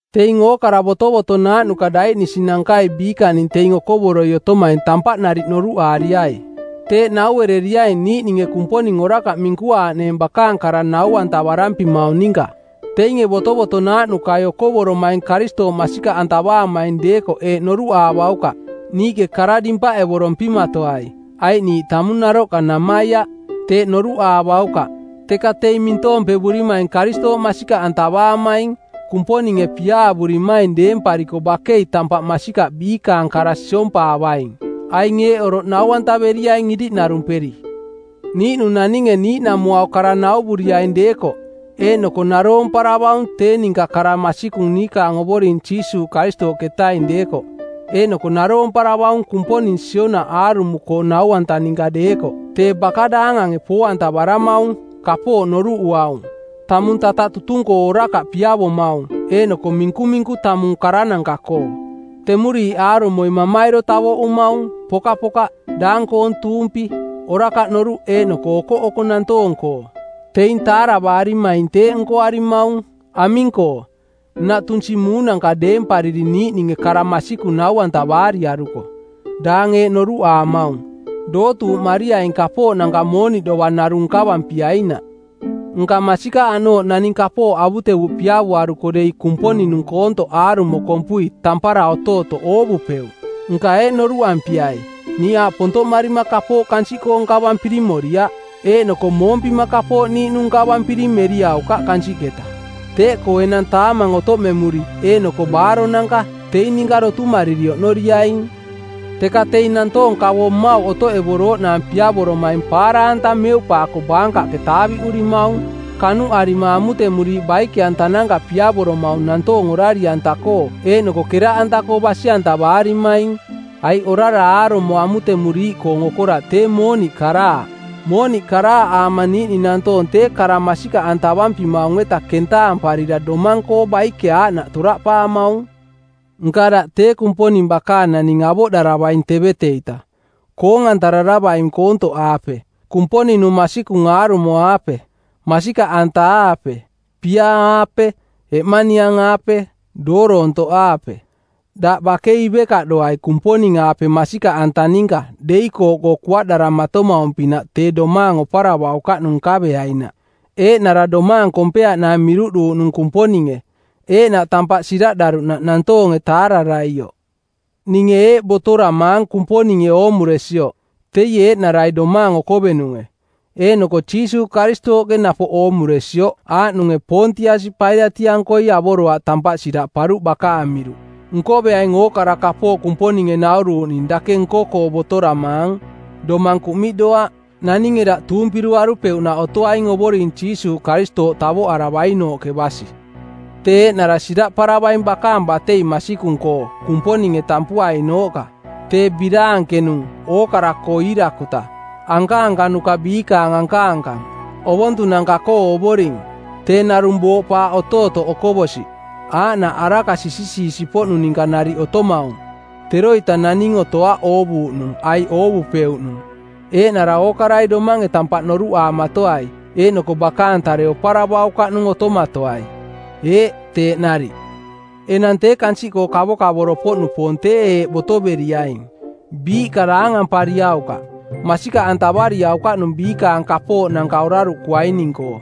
Teing ookara botovotonaaꞌnuka daiꞌnisinankai biikaning teing okovoroi otomaing tampaꞌ nariꞌ noruꞌaariai. Teeꞌ naueriaing niiꞌninge Kumponing orakaꞌ minkuaaꞌneeng bakaang kara nau-antavarampimaung ninka. Teinge botovotonaaꞌnukai okovoromaing Karistooꞌ masikaꞌantavaamaing deekoꞌ eeꞌ noruꞌaavaukaꞌ: “Niiꞌke kara dimpaꞌevorompimatoai, aiꞌ niiꞌ tamung naroꞌka namaiaꞌ.” Teeꞌ noruꞌaavaukaꞌ, teka teing mintoompevurimaing Karistooꞌ masikaꞌantavaamaing, Kumponinge piaavurimaing deempariko bakei tampaꞌ masikaꞌ biikaang kara siompaavaing. Aing eeꞌ oroꞌ nau-antaveriaing iriꞌnarumperi. Niiꞌnung naninge niiꞌnamuau kara nauvuriaing deekoꞌ, eeꞌnoko naroomparavaung tee ninka kara masikung niikaang Ovoring Jiisuuꞌ Karistooꞌketaing deekoꞌ eeꞌnoko naroomparavaung Kumponing sionaꞌ aarumo-koong nau-anta ninka deekoꞌ tee baka daangange poo-antavaramaung, kapooꞌ noruꞌuaung, tamung tataꞌ tutung-koo orakaꞌ piavomaung eeꞌnoko minkuminku tamung karananka-koo; Temuriiꞌ aarumoi mamairo tavoꞌumaung, pokaka, daang-koong tuumpi, orakaꞌ noruꞌ eeꞌnoko okoꞌoko nantoong-koo. Teing taaravarimaing teeꞌ nkoarimaung. Aming-koo, nnaꞌ tunsi muunanka deempariri niiꞌninge kara masikung nau-antavaariaruko. Daang eeꞌ noruꞌaamaung, “Dootuuꞌmariaing kapooꞌnanka mooniꞌ dovang narung nkavampiainaꞌ.” Nka masikaꞌ aꞌnooꞌ naning kapooꞌ avutevuꞌ piavoaruko dei Kumponing-nung koontoꞌ aarumo kompui tampara otootoꞌ oovupeuꞌ. Nka eeꞌ noruꞌampiai: “Niiꞌ aaꞌ pontoꞌmarima kapooꞌ kansiꞌkoo nkavampiri moriaꞌ, eeꞌnoko moompima kapooꞌ niiꞌnung nkavampiring meriaukaꞌ kansiꞌketa. Teeꞌkoo enang taamang otoꞌmemuri eeꞌnoko baaronanka, teing ninka dotumariri oꞌnoriaing.” Teka teing nantoong kavo mmauꞌ otoꞌevorooꞌnaang piavoromaing paara-anta meuꞌpaako baankaꞌke taaviꞌurimaung. Kanuꞌarima amutemuriiꞌ baike-antananka piavoromaung nantoong orari-anta-koo eeꞌnoko keraꞌanta-koo basi-antavaarimaing. Aiꞌ orara aarumo amutemuriiꞌkoong okoraꞌ tee mooniꞌ karaaꞌ. Mooniꞌ karaaꞌaama niiꞌning nantoong tee kara masikaꞌantavampimaung-eta kentaamparira domang-koo baike aaꞌnaꞌ toraꞌpaamaung. Nka daꞌ tee Kumponing bakaang naning avoꞌdaravaing tevete-ita; koong-antararavaing koontoꞌaape, Kumponing-nung masikung aarumo-aape, masikaꞌanta-aape, piaa-aape, eꞌmaniang-aape, dooroontoꞌaape. Daꞌ bakei ivekaꞌdoai Kumponing-aape masikaꞌanta ninka deikooꞌkoo kuaꞌdaramatomaung-pinaꞌ tee domaang oparavaukaꞌnung nkaveainaꞌ, eeꞌnara domaang kompeeꞌnaang miruꞌduuꞌnung Kumponinge, eeꞌnaꞌ tampaꞌ siraꞌdaruꞌnaꞌ nantoonge taararaioꞌ. Ninge eeꞌ botoramaang Kumponinge oomuresioꞌ, teie eeꞌnarai Domaang Okovenunge, eeꞌnoko Jiisuuꞌ Karistooꞌke napoꞌ oomuresioꞌ aaꞌnunge Poontiasi Pailatiꞌankoi avoroaꞌ tampaꞌ siraꞌparuꞌ bakaang miruꞌ: Nkoveaing ookara kapooꞌ Kumponinge nauruuꞌning dake nko-koo botoramaang, domang kuꞌmiꞌdoaꞌ. Naninge daꞌ tuumpiruarupeuꞌnaꞌ otoaing Ovoring Jiisuuꞌ Karistooꞌ tavoꞌaravainooꞌke basi. Tee eeꞌnara siraꞌparavaing bakaang batei masikung-koo, Kumponinge tampuainooꞌka. Tee biraankenung, ookara-koo iirakuta, ankaankanuka biikaang ankaankang, ovontunanka-koo Ovoring. Tee narung booꞌpaaꞌ otootoꞌ okovosiꞌ, aaꞌnaꞌ araka sisisiisiꞌpoꞌnung ninka nariꞌ otomaung, teroita naning otoaꞌ oovuuꞌnung aiꞌ oovupeuꞌnung. Eeꞌnara ookarai domange tampaꞌ noruꞌaamatoai eeꞌnoko bakaang tare oparavaukaꞌnung otomatoai. Eeꞌ, teeꞌ nariꞌ. Enang tee kansiꞌkoo kavokavoro-poꞌnupoong tee eeꞌ botoveriaing: Biiꞌka daangampariaukaꞌ. Masikaꞌantavariaukaꞌnung biikaang kapooꞌnanka oraruꞌkuaining-koo,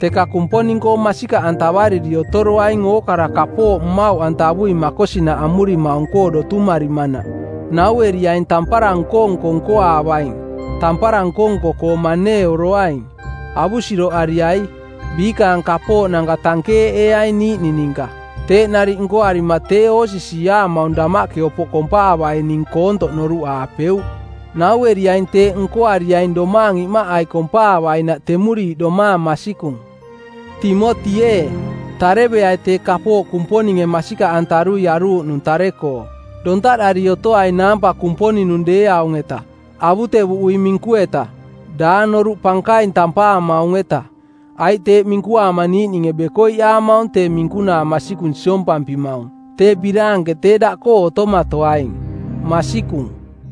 teka Kumponing-koo masikaꞌantavariri otoroaing ookara kapooꞌ mmauꞌantavui makosinaꞌ amurimaung-koo dotumarimanaꞌ. Naueriaing tampara nko-nko nkoaavaing, tampara nko-nko-koo maneeoroaing, avusiroꞌariai, biikaang kapooꞌnanka tankeeꞌeeaing niiꞌning ninka. Teeꞌ nariꞌ nkoarima tee oosisiiaamaung damaꞌke opoꞌ kompaavaining koontoꞌ noruꞌaapeuꞌ. Naueriaing teeꞌ nkoariaing domaang imaꞌai kompaavainaꞌ temuriiꞌ domaang masikung. Timoti ee, tareveai tee kapooꞌ Kumponinge masikaꞌantarui aruuꞌnung tare-koo. Dontaꞌdari otoai naampa Kumponing-nung deeaung-eta, avutevuꞌui minku-eta, daang noruꞌ pankaing tampaamaung-eta. Aiꞌ teeꞌ minkuaama niiꞌninge bekoiꞌaamaung tee minkunaa masikung siompampimaung. Tee biraanke tee daꞌkoo otomatoaing. Masikung.